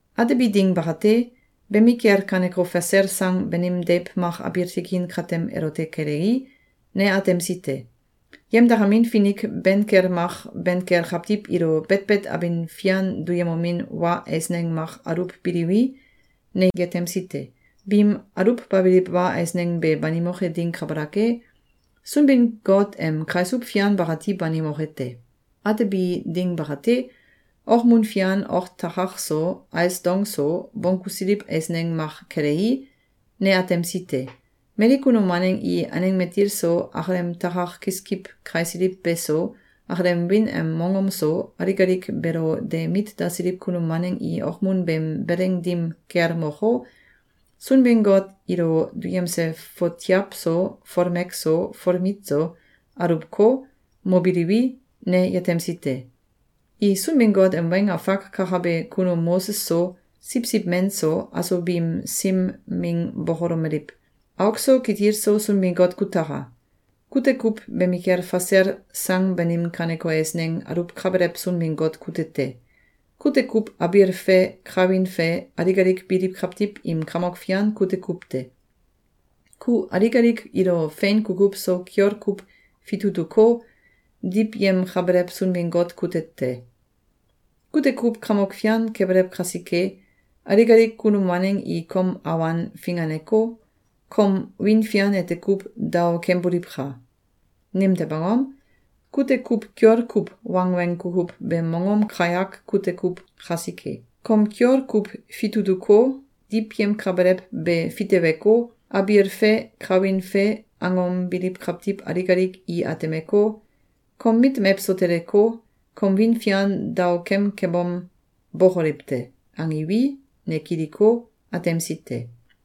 Atebi ding bakate, bemikel kaneko fasel sang banim deiw mak abiil tikin katem elote kelei, ne atemsi te. Yemdakamin finik ben kel mak ben kel kawtiw ilo betbet abin fian duyemomin wa eisneng mak aluwbiliwi, ne yetemsi te. Biim aluwbabiliw wa eisneng be banimoke ding kabalak e, Sunbin-Got em kaisuw fian bakati banimoke te. Atebi ding bakate, okmun fian ok takak so, ais dong so, bonggusiliw eisneng mak kelei, ne atemsi te. Mali kunum waneng i aneng matil so, akalem takak kiskiw kaisiliw beso, akalem wiin em mongom so, alik alik beelo de mit dasiliw kunum waneng i okmun beem beleng dim kel moko, Sunbin-Got ilo duyemse fotiaw so, folmek so, folmit so, aluwko, mobiliwi, ne yetemsi te. I Sunbin-Got em weng afak kakabe kunum Moses so, Siwsiw Men so, aso biim sim ming bokolomeliw: “Auk so kitil so Sunbin-Got kutaka! Kute kuw bemikel fasel sang banim kaneko eisneng aluwkabelew Sunbin-Got kute te. Kute kuw abiil fe kawin fe alik alik biliw kawtiw im Kamok Fian kute kuw te! Ku alik alik ilo fein kukuw so kiol kuw fitutuko, diwyemkabelew Sunbin-Got kute te. Kute kuw Kamok Fian kebelew kasike, alik alik kunum waneng i kom awan finganeko, kom wiin fian ete kuw daokemboliwka! Nimtew angom? Kute kuw kiol kuw wangweng kukuw beem mongom kayak kute kuw kasike. Kom kiol kuw fitutuko, diwyemkabelew be fiteweko, abiil fe kawin fe angom biliw kawtiw alik alik i atemeko, kom mit mewso teleko, kom wiin fian daokemkebom, bókoliw te!”, angiwi, ne kiliko, atemsi te.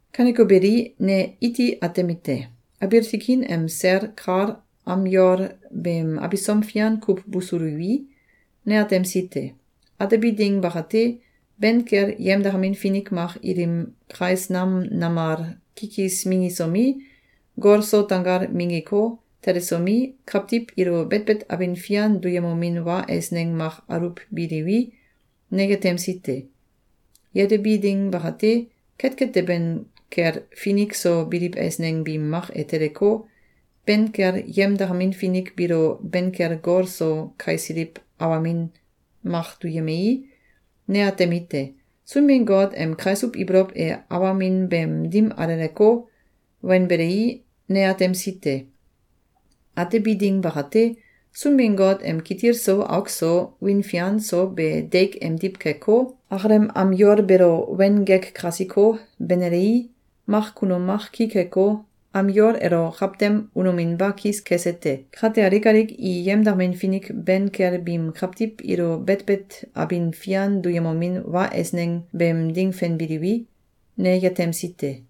Kaneko beli, ne iti atemite: Abiil tikin em sel kal am yol beem abisom fian kuw busuliwi, ne atemsi te. Atebi ding bakate, ben kel yemdakamin finik mak ilim kais nam namal kikis minggisomi, gol so tanggal minggiko, telesomi, kawtiw ilo betbet abin fian duyemomin wa eisneng mak aluwbiliwi, ne yetemsi te. Yetebi ding bakate, ketket teben kel finik so biliw eisneng biim mak e teleko, ben kel yemdakamin finik biilo ben kel gol so kaisiliw awamin mak duyemei, ne atemite: Sunbin-Got em kaisuw ibolow e awamin beem dim aleleko, wenbelei, ne atemsi te. Atebi ding bakate, Sunbin-Got em kitil so auk so, wiin fian so be deik emdiw keko, akalem am yol beelo wen gek kasiko, benelei, mak kunum mak ki keko, am yol elo kawtem unominba kis kese te. Kate alik alik i yemdakamin finik ben kel biim kawtiw ilo betbet abin fian duyemomin wa eisneng beem ding fenbiliwi, ne yetemsi te.